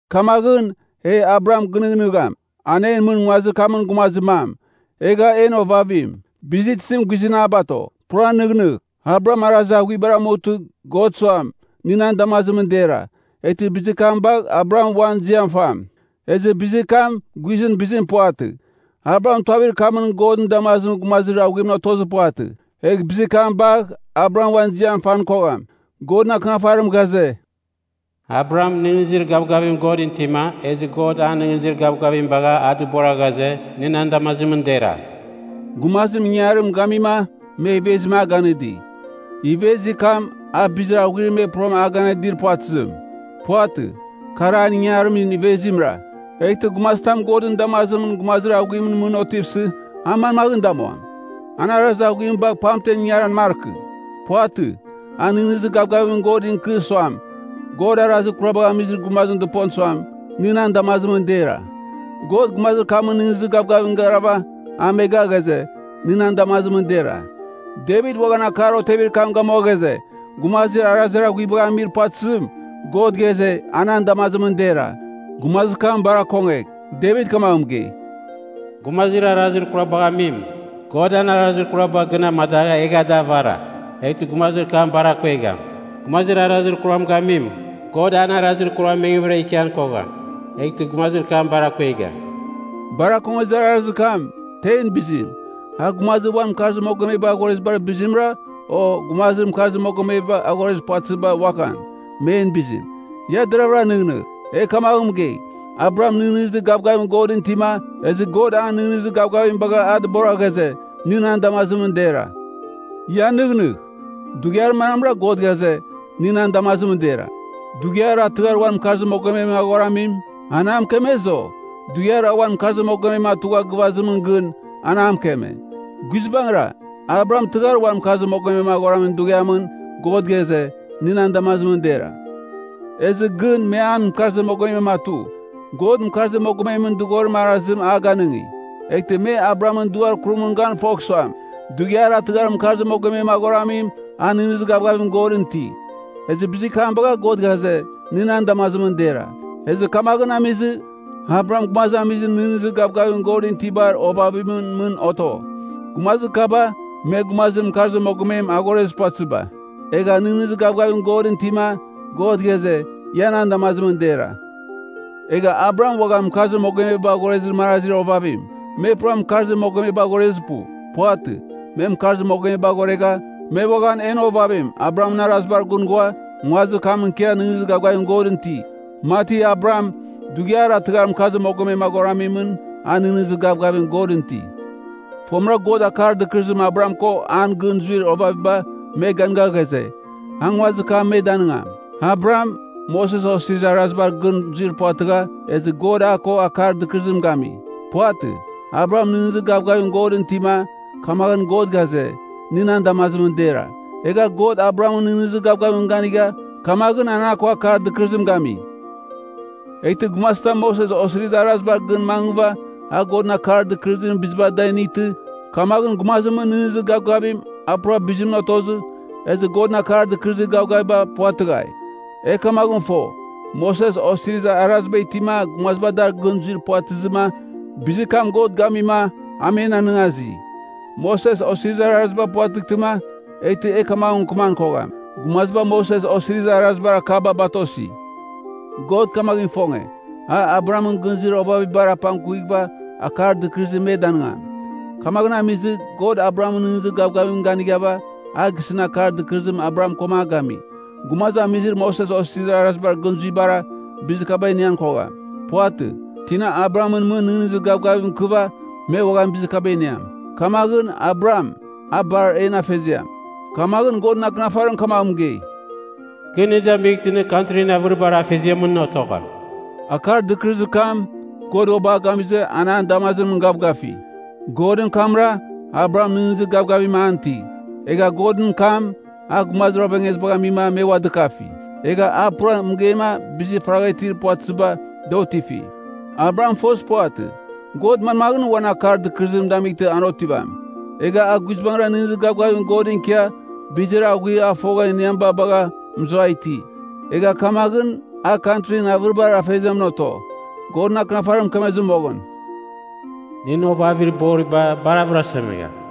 Kamaghɨn, e Abraham gɨnɨghnɨgham, an en mɨn nguazir kamɨn gumazir mam, egha en ovavim. Bizir tizim guizɨn a bato? Pura nɨghnɨgh: Abraham arazir aghuibar amutɨ, God suam nɨ nan damazimɨn dera, eghtɨ bizir kam bagh Abraham uan ziam fam. Ezɨ bizir kam guizɨn bizim puvatɨ. Abraham tuavir kamɨn Godɨn damazimɨn gumazir aghuim otozir puvatɨ. Egh bizir kam bagh Abraham uan ziam fan kogham. Godɨn Akɨnafarim ghaze, “Abraham nɨghnɨzir gavgavim Godɨn itima, ezɨ God an nɨghnɨzir gavgavim bagha a dɨbora ghaze, nɨ nan damazimɨn dera.” Gumazim ingangarim gamima, me ivezim a ganɨdi. Ivezir kam, a bizir aghuir me pura a ganɨdir puvatɨzim. Puvatɨ. Kar an ingangarimɨn ivezimra. Eghtɨ gumazitam Godɨn damazimɨn gumazir aghuimɨn mɨn otivsɨ, a manmaghɨn damuam? An arazir aghuim bagh pamten ingaran markɨ. Puvatɨ. A nɨghnɨzir gavgavim Godɨn ikɨ suam, God arazir kurabagh amizir gumazim dɨpon suam, nɨ nan damazimɨn dera. God gumazir kamɨn nɨghnɨzir gavgavimɨn garava a medagha ghaze, nɨ nan damazimɨn dera. Devit uaghan akar otevir kam gamua ghaze, gumazir arazir aghuibagh amir puvatɨzim, God ghaze, a nan damazimɨn dera. Gumazir kam bar akongegh. Devit kamaghɨn mɨgei, “Gumazir arazir kurabagh amim, God an arazir kuraba gɨn amadagha egha da avara, eghtɨ gumazir kam bar akuegham. Gumazir arazir kuram gamim, God an arazir kuram mengvɨra ikian kogham, eghtɨ gumazir kam bar akuegham.” Bar akongezir arazir kam, tein bizim? A gumazir uan mɨkarzir mogomebar aghorezibar bizimra? O, gumazir mɨkarzir mogomebar aghorezir puvatɨziba uaghan, men bizim? Ia deravɨra nɨghnɨgh. E kamaghɨn mɨgei, “Abraham nɨghnɨzir gavgavim Godɨn itima, ezɨ God an nɨghnɨzir gavgavim bagha a dɨbora ghaze, nɨ nan damazimɨn dera.” Ia nɨghnɨgh, dughiar manamra God ghaze, nɨ nan damazimɨn dera? Dughiar a tɨghar uan mɨkarzir mogomem aghoramim, an a mɨkemezɨ, o? Dughiar a uan mɨkarzir mogomem atugha gɨvazimɨn gɨn, an a mɨkeme? Guizbangɨra, Abraham tɨghar uan mɨkarzir mogomem aghoramin dughiamɨn God ghaze, nɨ nan damazimɨn dera! Ezɨ gɨn, me an mɨkarzir mogomem atu. God mɨkarzir mogomemɨn dɨghorimɨn arazim a ganɨngi, eghtɨ me Abrahamɨn duar kurimɨn gan fogh suam, dughiar a tɨghar mɨkarzir mogomem aghoramim a nɨghnɨzir gavgavim Godɨn iti. Ezɨ bizir kam bagha God ghaze, nɨ nan damazimɨn dera. Ezɨ kamaghɨn amizɨ, Abraham gumazamizir nɨghnɨzir gavgavim Godɨn itibar ovavimɨn mɨn oto. Gumazir kaba, me gumazir mɨkarzir mogomem aghorezir puvatɨziba. Egha nɨghnɨzir gavgavim Godɨn itima God ghaze, ia nan damazimɨn dera. Egha Abraham uaghan mɨkarzir mogomeba aghorezir marazir ovavim, me pura mɨkarzir mogomeba aghorezir pu. Puvatɨ. Me mɨkarzir mogomeba aghoregha, me uaghan en ovavim Abrahamɨn arazibar gɨn ghua, nguazir kamɨn ikia nɨghnɨzir gavgavim Godɨn iti, mati Abraham, dughiar a tɨghar mɨkarzir mogomem aghoramimɨn, a nɨghnɨzir gavgavim Godɨn iti. Fomɨra God akar dɨkɨrɨzim Abraham ko an gɨn zuir ovaviba me ganɨga ghaze, a nguazir kam me danɨngam. Abraham, Moses Osirizir Arazibar gɨn zuir puvatɨgha, ezɨ God a ko akar dɨkɨrɨzim gami. Puvatɨ, Abraham nɨghnɨzir gavgavim Godɨn itima, kamaghɨn God ghaze, nɨ nan damazimɨn dera. Egha God Abrahamɨn nɨghnɨzir gavgavimɨn ganigha, kamaghɨn a ko akar dɨkɨrɨzim gami. Eghtɨ gumazitam Moses Osirizir Arazibar gɨn mangɨva a Godɨn akar dɨkɨrɨzimɨn biziba da initɨ, kamaghɨn gumazimɨn nɨghnɨzir gavgavim a pura bizimɨn otozɨ, ezɨ Godɨn akar dɨkɨrɨzim gavgaviba puvatɨghai. E kamaghɨn fo, Moses Osirizir Araziba itima gumaziba dar gɨn zuir puvatɨzɨma bizir kam God gamima a men anɨngazi. Moses Osirizir Araziba puvatɨghtɨma, eghtɨ e kamaghɨn mɨkɨman kogham, gumaziba Moses Osirizir Arazibar akaba batosi. God kamaghɨn ifonge, a Abrahamɨn gɨn zuir ovavibar apangkuvighɨva akar dɨkɨrɨzim me danɨngam. Kamaghɨn amizɨ, God Abrahamɨn nɨghnɨzir gavgavimɨn ganighava, a gisɨn akar dɨkɨrɨzim Abraham koma a gami. Gumazamizir Moses Osirizir Arazibar gɨn zuibara, bizir kaba inian kogham. Puvatɨ. Tina Abrahamɨn mɨn nɨghnɨzir gavgavim ikɨva me uaghan bizir kaba iniam. Kamaghɨn, Abraham, a bar en afeziam. Kamaghɨn Godɨn Akɨnafarim kamaghɨn mɨgei, “Kɨ nɨ damightɨ nɨ kantrin avɨribar afeziamɨn otogham.” Akar dɨkɨrɨzir kam, God uabɨ a gamizɨ an an damazimɨn gavgafi. Godɨn kamra, Abraham nɨghnɨzir gavgavim an iti. Egha Godɨn kam, a gumazir ovengezibagh amima me ua dɨkafi, egha a pura mɨgeima bizir faragha itir puvatɨziba, da otifi. Abraham fozir puvatɨ, God manmaghɨn uan akar dɨkɨrɨzim damightɨ an otivam. Egha a guizbangɨra nɨghnɨzir gavgavim Godɨn ikia, bizir aghuir a fogha iniamiba bagha mɨzuai iti. Egha kamaghɨn a “Kantrin avɨribar afeziamɨn oto.” Godɨn Akɨnafarim mɨkemezɨ moghɨn, “Nɨn ovavir boriba bar avɨrasemegham.”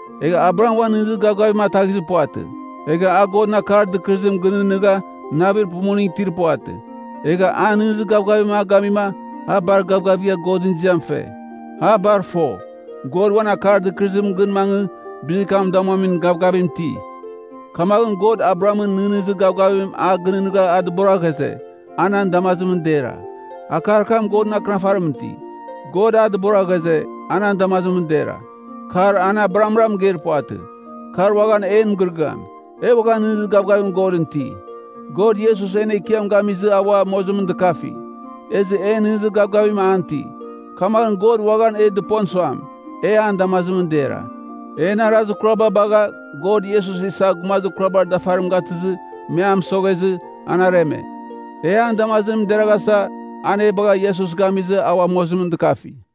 Egha Abraham uan nɨghnɨzir gavgavim anetaghizir puvatɨ. Egha a Godɨn akar dɨkɨrɨzim gɨnɨghnɨgha navir pumuningɨn itir puvatɨ. Egha an nɨghnɨzir gavgavim a gamima a bar gavgavigha Godɨn ziam fe. A bar fo, God uan akar dɨkɨrɨzimɨn gɨn mangɨ bizir kam damuamin gavgavim iti. Kamaghɨn God Abrahamɨn nɨghnɨzir gavgavim a gɨnɨghnɨgha a dɨbora ghaze, a nan damazimɨn dera. Akar kam Godɨn Akɨnafarimɨn iti, “God a dɨbora ghaze, a nan damazimɨn dera.” Kar an Abrahamra mɨgeir puvatɨ. Kar uaghan en mɨgɨrɨgɨam. E uaghan nɨghnɨzir gavgavim Godɨn iti. God Iesus en Ekiam gamizɨ a ua mozimɨn dɨkafi, ezɨ e nɨghnɨzir gavgavim an iti. Kamaghɨn God uaghan e dɨpon suam, ia nan damazimɨn dera. En arazir kuraba bagha, God Iesus isa gumazir kurabar dafarim gatɨzɨ me a mɨsoghezɨ, an areme. E an damazimɨn deraghasa, an e bagha Iesus gamizɨ a ua mozimɨn dɨkafi.